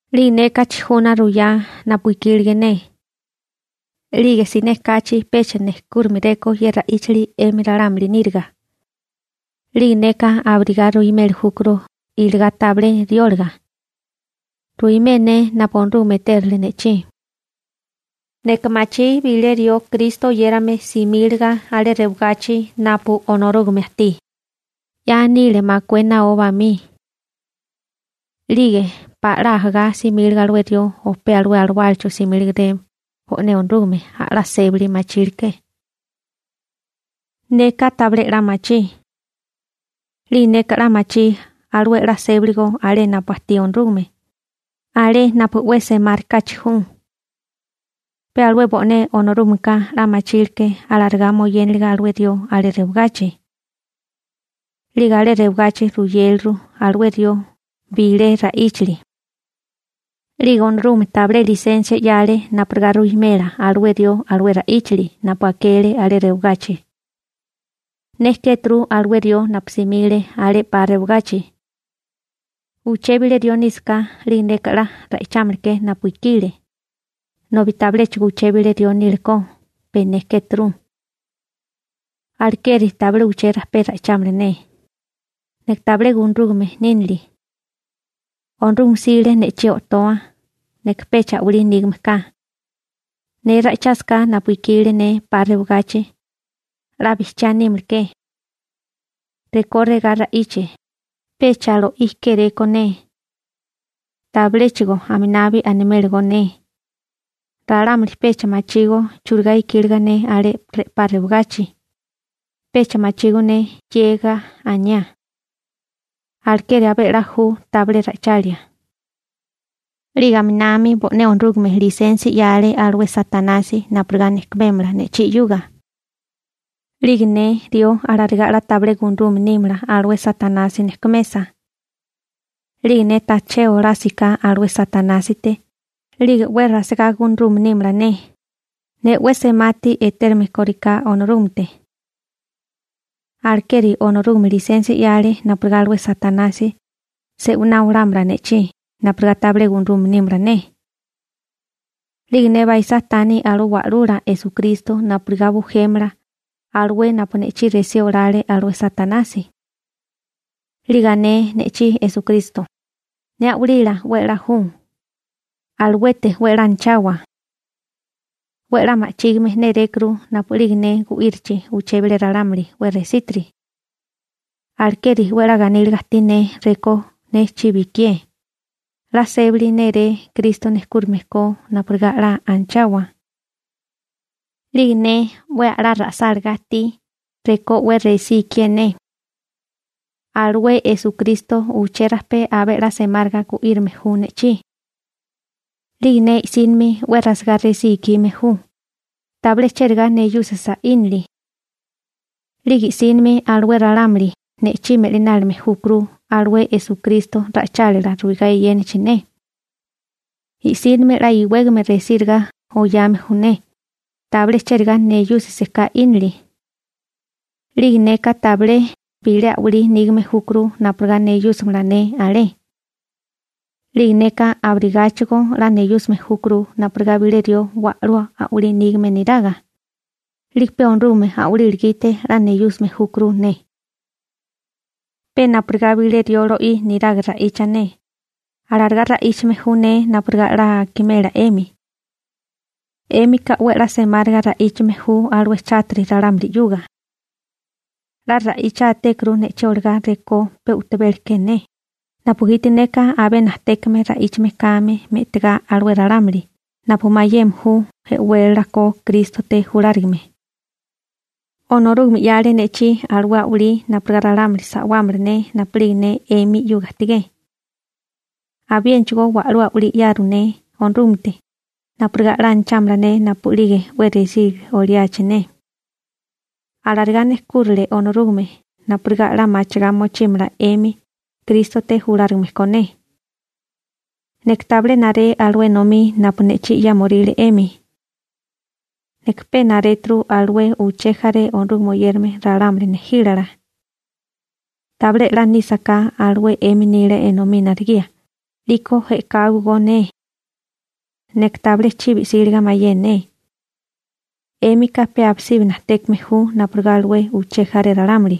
'Lige neka chijuna ruyá napu ikílige ne. 'Lige siné kachi pecha nejkúrimeréko ye ra'íchali 'emi ralámuli níriga. 'Lige neka abirigá ruimeli júkuru iligá tabilé rióliga. Ruimé ne napu Onorúgame etérale ne'chí. Neka machí bilé rió Kristo oyérame simíliga alé rewagachi napu Onorúgame ajtí, 'ya nile makué naó bamí. 'Lige pala 'la ajagá simíliga alué rió o pe alué alawálacho simílegeré Bo'né Onorúgameka a'lá sébali machíleké. Neka tabilé 'la machí. 'Lige neka 'la machí alué 'la sébaligo alé napu ajtí Onorúgame, alé napu 'we semárikáchi ju. Pe alué bo'né Onorúgameka 'la machíleké alarigá moyénaliga alué rió alé rewagachi. 'Lige alé rewagachi ruyéleru alué rió bilé ra'íchali. 'Lige Onorúgame tabilé lisensia 'yale napurigá ruwimela alué rió alué ra'íchali napu akele alé rewagachi. Ne kéturu alué rió napu simile alé 'pa rewagachi. Uché bilé rió nísaká, 'lige neka 'la ra'ichámala ke napu ikile, nobi tabiléchigo uché bilé rió nílekó, pe ne kéturu. Alekeri tabilé uché rajpé ra'ichámala ne, neka tabilé gunarúgame nínili. Onorúgame 'sile ne'chí o'toa. Neka pecha a'walí nígame ka. Ne ra'ichásaká napu ikile ne 'pa rewagachi, 'la bijchiá nímala ke. Rekó regá ra'iche, pecha lo'í kéréko ne. Tabiléchigo aminabi animélagó ne. Ralámuli pecha machígó churigá ikíliga ne alé re'pá rewagachi, pecha machígó ne 'yega aniá. Alekeri abé a'lá ju tabilé ra'ichalia. 'Lige aminami bo'né Onorúgame lisensia 'yale alué Satanasi napurigá nejkumémala ne'chí 'yuga. 'Lige ne rió alarigá 'la tabilé gunarume nímala alué Satanasi nejkumesa. 'Lige ne tajché olásigaká alué Satanásite, 'lige 'we rasigá gunarume nímala ne, ne 'we semati etérume kóriká Onorúgamete. Alekeri Onorúgame lisensia 'yale napurigá alué Satanasi se'winá olámala ne'chí napurigá tabilé gunarume nímala ne. 'Lige ne baisá tani alué Wa'lula Esukristo napurigá bujémala alué napu ne'chí resí olale alué Satanasi, 'lige ané ne'chí Esukristo: «Ne a'walila 'we 'la ju, aluete 'we 'la anachawa. 'We 'la ma'chígime nérékuru napu'lige ne gu'írichi alué bilé ralámuli 'we resítiri.» Alekeri 'we 'la ganíliga ajtí ne rekó ne chibi ikié, 'la sébali néré Kristo nejkúrime ko napurigá 'la anachawa. 'Lige ne 'we a'lá ra'sálagá ajtí rekó 'we resí ikié ne, alué Esukristo uché rajpé abé a'lá semáriga gu'írame ju ne'chí. 'Lige ne i'sínimi 'we rasigá resí ikime ju, tabilé chérigá neyúsisa 'ínili. 'Lige i'sínimi alué ralámuli ne'chí me'linálime júkuru alué Esukristo ra'ichálila ruigá eyénachi ne. I'sínimi 'la iwégame resíriga oyame ju ne, tabilé chérigá neyúsisaká 'ínili. 'Lige neka tabilé bilé a'walí nígame júkuru napurigá neyúsimala ne alé. 'Lige neka abirigáchigo 'la neyúsime júkuru napurigá bilé rió wa'lú a'walí nígame niraga, 'lige pe Onorúgame a'walila gite 'la neyúsime júkuru ne. Pe napurigá bilé rió lo'í niraga ra'icha ne, alarigá ra'íchame ju ne napurigá 'la akimela 'emi. 'Émika 'we 'la semáriga ra'íchame ju alué chátiri ralámuli 'yuga. 'La ra'ichátékuru ne'chí olagá rekó pe u'tabela ke ne, napugiti neka abé najtékame ra'íchame kame me'tigá alué ralámuli napu mayeme ju e'wélala ko Krístote julárigame. Onorúgame 'yale ne'chí alué a'walí napurigá ralámuli sa'wámala ne napu'lige ne 'emi 'yuga ajtigé. Abiénachigó wa'lú a'walí 'yaru ne Onorúgamete napurigá 'la anachámala ne napu'lige 'we resí oliachi ne. Alarigá nejkúrile Onorúgame napurigá 'la machigá mochímala 'emi Krístote julárigame ko ne. Neka tabilé naré alué enomí napu ne'chí 'yámoríle 'emi. Neka pe naréturu alué uché jaré Onorúgame oyérame ralámuli nejílala. Tabilé 'la nísaká alué 'emi nila enomí naregía, 'liko e'káibogó ne. Neka tabilé chibi 'síliga mayé ne. 'Émika pe abisibi najtékame ju napurigá alué uché jaré ralámuli.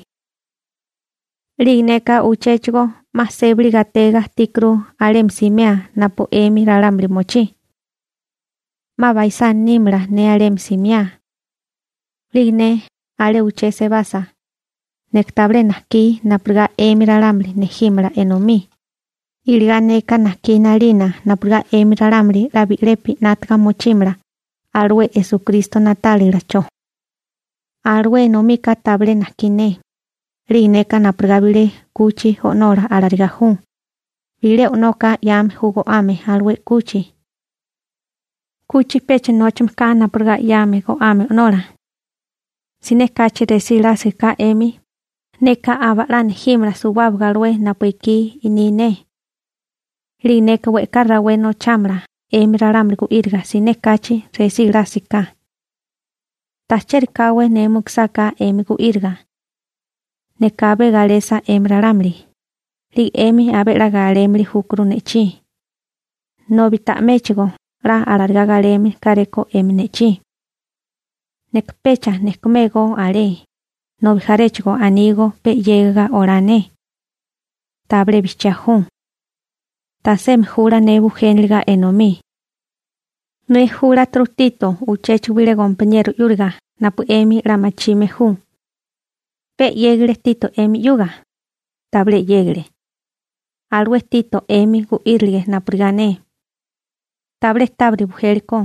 'Lige neka uchéchigo 'ma sébali gatega ajtíkuru alemi simea ne napu 'emi ralámuli mochí. 'Ma baisá nímala ne alemi simiá. 'Lige ne alé uché sebasa, neka tabilé najkí napurigá 'emi ralámuli nejímala enomí, iligá neka najkí 'nalina napurigá 'emi ralámuli 'la bi'lepi 'nátaga mochímala alué Esukristo na'tálilacho. Alué enomika tabilé najkí ne. 'Lige neka napurigá bilé 'kuchi o'nola alarigá ju. Bilé o'noka 'yame ju go'ame alué 'kuchi. 'Kuchi pecha nóchame ka napurigá 'yame go'ame o'nola. Siné kachi resí lásiga ka 'emi, neka aba'lá nejímala suwábaga alué napu ekí ni ne. 'Lige neka we'ká rawé nochámala 'emi ralámuli gu'íriga siné kachi resí lásiga ka. Ta cheri káwé ne mukusáká 'emi gu'íriga. Neka abé galesa 'emi ralámuli, 'lige 'emi abé 'la galémili júkuru ne'chí, nobi ta'méchigo 'la alarigá galeme káréko 'emi ne'chí. Neka pecha nejkumégó alé, nobi jaréchigo anígó pe 'yégiga olá ne. Tabilé bijchiá ju. Tasemi jula ne bujéniliga enomí. Ne júleturu Tito uchéchigo bilé gompaniero 'yúriga napu 'emi 'la machime ju. ¿Pe 'yégile Tito 'emi 'yuga? Tabilé 'yégile. Alué Tito 'emi gu'írile napurigá ne. Tabilé tábiri bujélikó.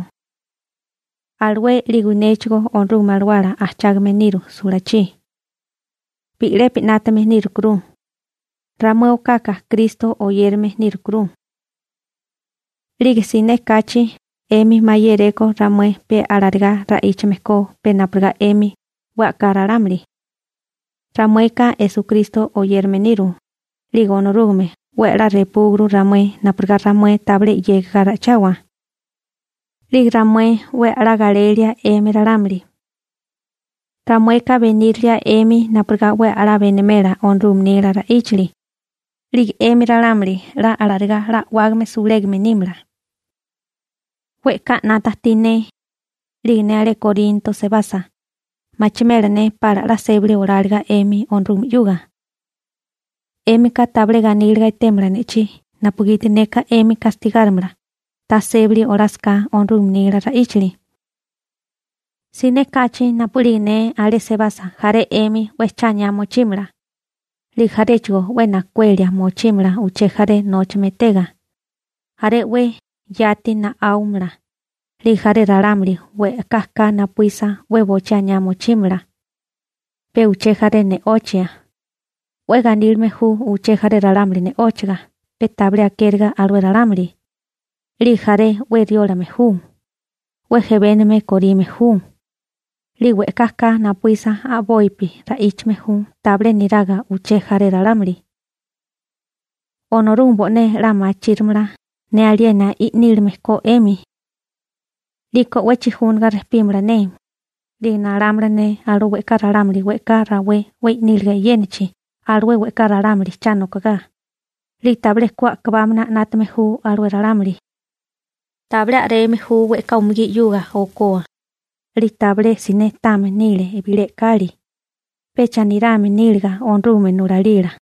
Alué 'lige néchigó Onorúgame Alawala ajchágame niru sulachí. Bi'lepi 'nátame nírukuru. Ramué okaka Kristo oyérame nírukuru. 'Lige siné kachi 'emi mayéréko ramué pe alarigá ra'íchame ko pe napurigá 'emi 'we a'ká ralámuli. Ramueka Esukristo oyérame niru, 'lige Onorúgame 'we a'lá repúguru ramué napurigá ramué tabilé 'yega ra'ichawa. 'Lige ramué 'we a'lá galelía 'emi ralámuli. Ramueka benírilia 'emi napurigá 'we a'lá benimela Onorúgame nila ra'íchali, 'lige 'emi ralámuli 'la alarigá 'la a'wágame sulégame nímala. We'ká 'nata ajtí ne, 'lige ne alé Korinto sebasa, machimela ne pala 'la sébali oláliga 'emi Onorúgame 'yuga. 'Émika tabilé ganíliga etémala ne'chí napugiti neka 'emi gastigárimala ta sébali olásaká Onorúgame nila ra'íchali. Siné kachi napu'lige ne alé sebasa jaré 'emi 'we cha aniá mochímala, 'lige jaréchigo 'we najkuelia mochímala uché jaré nóchame etega, jaré 'we yati na'áumala 'lige jaré ralámuli we'ká ka napuísa 'we bochí aniá mochímala, pe uché jaré ne'ochia, 'we ganílime ju uché jaré ralámuli ne'óchaga pe tabilé akériga alué ralámuli, 'lige jaré 'we riólame ju, 'we jebénigame korime ju, 'lige we'ká ka napuísa a'bopi ra'íchame ju tabilé niraga uché jaré ralámuli. Onorúgame bo'né 'la machírimala ne aliena i'nílime ko 'emi. 'Liko 'we chijúnaga rejpímala ne, 'lige nalámala ne alué we'ká ralámuli we'ká rawé 'we i'níliga e'yénachi alué we'ká ralámuli cha nokogá, 'lige tabilé ku a'kabámana 'nátame ju alué ralámuli. Tabilé a'reme ju we'ká umugí 'yuga okoa, 'lige tabilé siné táame nile bilé e'kali, pecha nirame níliga Onorúgame nulalila.